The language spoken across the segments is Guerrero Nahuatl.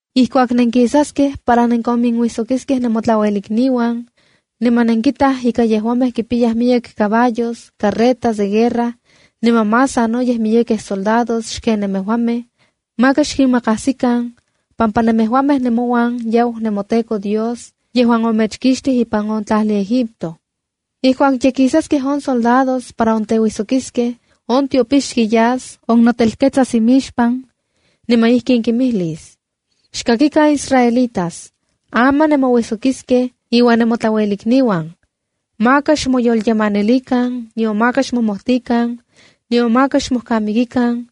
’Ijkuak nenkisaskej para nenkonminuijsokiskej nemotlauelikniuan, niman nenkintaj ika yejuamej kimpiyaj miyek caballos, carretas de guerra, niman más sanoyej miyekej soldados xken nemejuamej, maka xkinmakajsikan, pampa nemejuamej nemouan yau nemoTEKO Dios yejuan omechkixtij ipan on tlajli Egipto. Ijkuak ye kisaskej on soldados para onteuijsokiskej, on tiopixki yas onotelketsas imixpan, niman ijkin kimijlis: “Xkakikan israelitas, aman nemouijsokiskej iuan nemotlauelikniuan. Maka xmoyolyemanilikan, nion maka xmomojtikan, nion maka xmojkamikikan,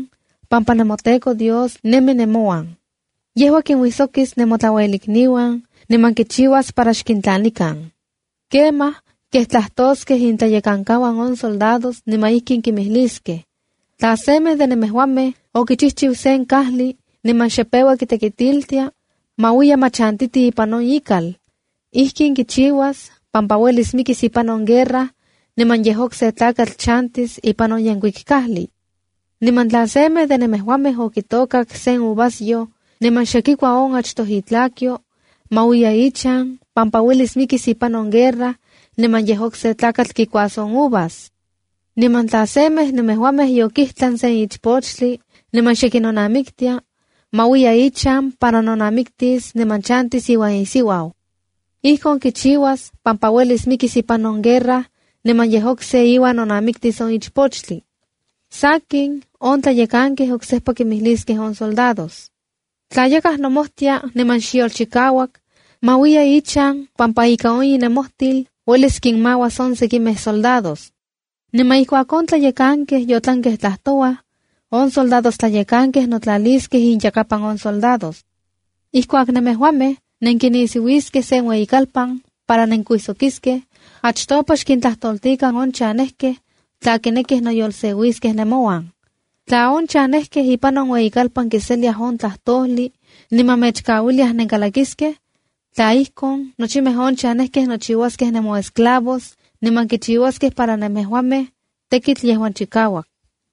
pampa nemoTEKO Dios nemi nemouan. Yejua kinuijsokis nemotlauelikniuan niman kichiuas para xkintlanikan.” ’Kemaj kej tlajtoskej intlayekankauan on soldados niman ijkin kimijliskej: “Tla semej de nemejuamej okichijchiu sen kajli niman xe peua kitekitiltia, ma uiya ma chantiti ipan on ikal. Ijkin kichiuas, pampa uelis mikis ipan on guerra niman yej okse tlakatl chantis ipan on yenkuik kajli. Niman tla semej de nemejuamej okitôkak sen uvasyoj niman xe kikua on achtoj itlakyo, ma uiya ichan, pampa uelis mikis ipan on guerra niman yej okse tlakatl kikuas on uvas. Niman tla semej nemejuamej yokijtlan sen ichpochtli niman xe kinonamiktia, ma uiya ichan para nonamiktis niman chantis iuan isiuau. Ijkon kichiuas pampa uelis mikis ipan on guerra niman yej okse iuan nonamiktis on ichpochtli.” ’Sakin, on tlayekankej oksejpa kinmijliskej on soldados: “Tla yakaj nomojtia niman xyolchikauak, ma uiya ichan pampa ika on inemojtil uelis kinmauas on sekimej soldados.” ’Niman ijkuak on tlayekankej yotlankej tlajtouaj, on soldadojtlayekankej notlaliskej inyakapan on soldados. ’Ijkuak nemejuamej nenkinisiuiskej sen ueyikalpan para nenkuijsokiskej, achtopa xkintlajtoltikan on chanejkej tla kinekij noyoltlaliskej nemouan. Tla on chanejkej ipan on ueyikalpan kiseliaj on tlajtojli niman mechkauiliaj nenkalakiskej, tla ijkon, nochimej on chanejkej nochiuaskej nemoesclavos niman kichiuaskej para nemejuamej, tekitl yejuan chikauak.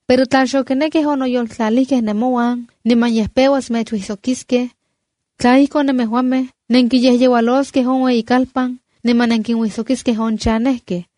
Pero tla xokinekkej onoyoltlalijkej nemouan niman yej peuas mechuijsokiskej, tla ijkon, nemejuamej nenkiyejyeualoskej on ueyikalpan niman nenkinuijsokiskej on chanejkej.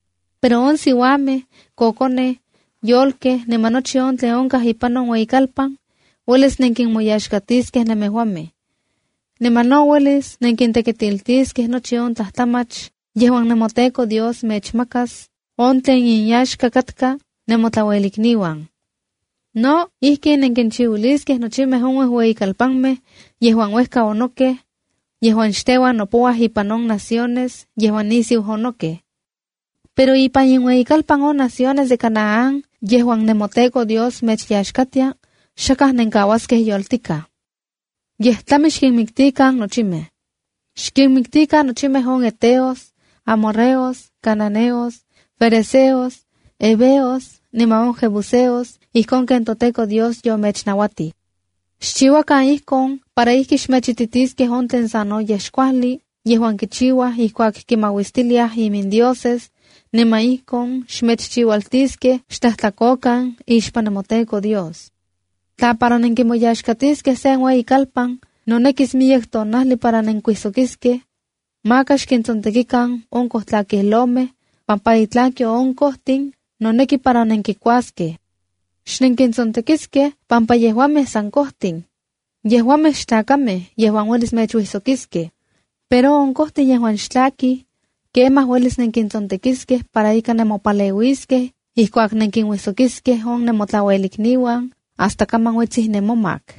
Pero on siuamej, kokonej, yolkej niman nochi on tlen onkaj ipan on ueyikalpan, uelis nenkinmoyaxkatiskej nemejuamej. Niman no uelis nenkintekitiltiskej nochi on tlajtlamach yejuan nemoTEKO Dios mechmakas on tlen inyaxka katka nemotlauelikniuan. No ijkin, nenkinchiuiliskej nochimej on uejueyikalpanmej yejuan uejka onokej, yejuan xteuan nopouaj ipan in naciones yejuan nisiu onokej. ’Pero ipan inueyikalpanuan on naciones de Canaán yejuan nemoTEKO Dios mechyaxkatia, xakaj nenkauaskej yoltikaj. Yej tlami xkinmiktikan nochimej. Xkinmiktikan nochimej on heteos, amorreos, cananeos, ferezeos, heveos, niman on jebuseos ijkon ken toTEKO Dios yomechnauatij. Xchiuakan ijkon para ijki xmechititiskej on tlen sanoyej xkuajli yejuan kichiuaj ijkuak kinmauistiliaj imindioses, niman ijkon mechchiualtiskej xtlajtlakokan ixpan nemoTEKO Dios. ’Tla para nenkimoyaxkatiskej sen ueyikalpan nonekis miyek tonajli para nenkuijsokiskej, maka xkintsontekikan on kojtlakijlomej pampa itlakyo on kojtin noneki para nenkikuaskej. Xnenkintsontekiskej pampa yejuamej san kojtin. Yejuamej xtlakamej yejuan uelis mechuijsokiskej. Pero on kojtin yejuan xtlakij, kemaj uelis nenkintsontekiskej para ika nemopaleuiskej ijkuak nenkinuijsokiskej on nemotlauelikniuan hasta kaman uetsij nemomak.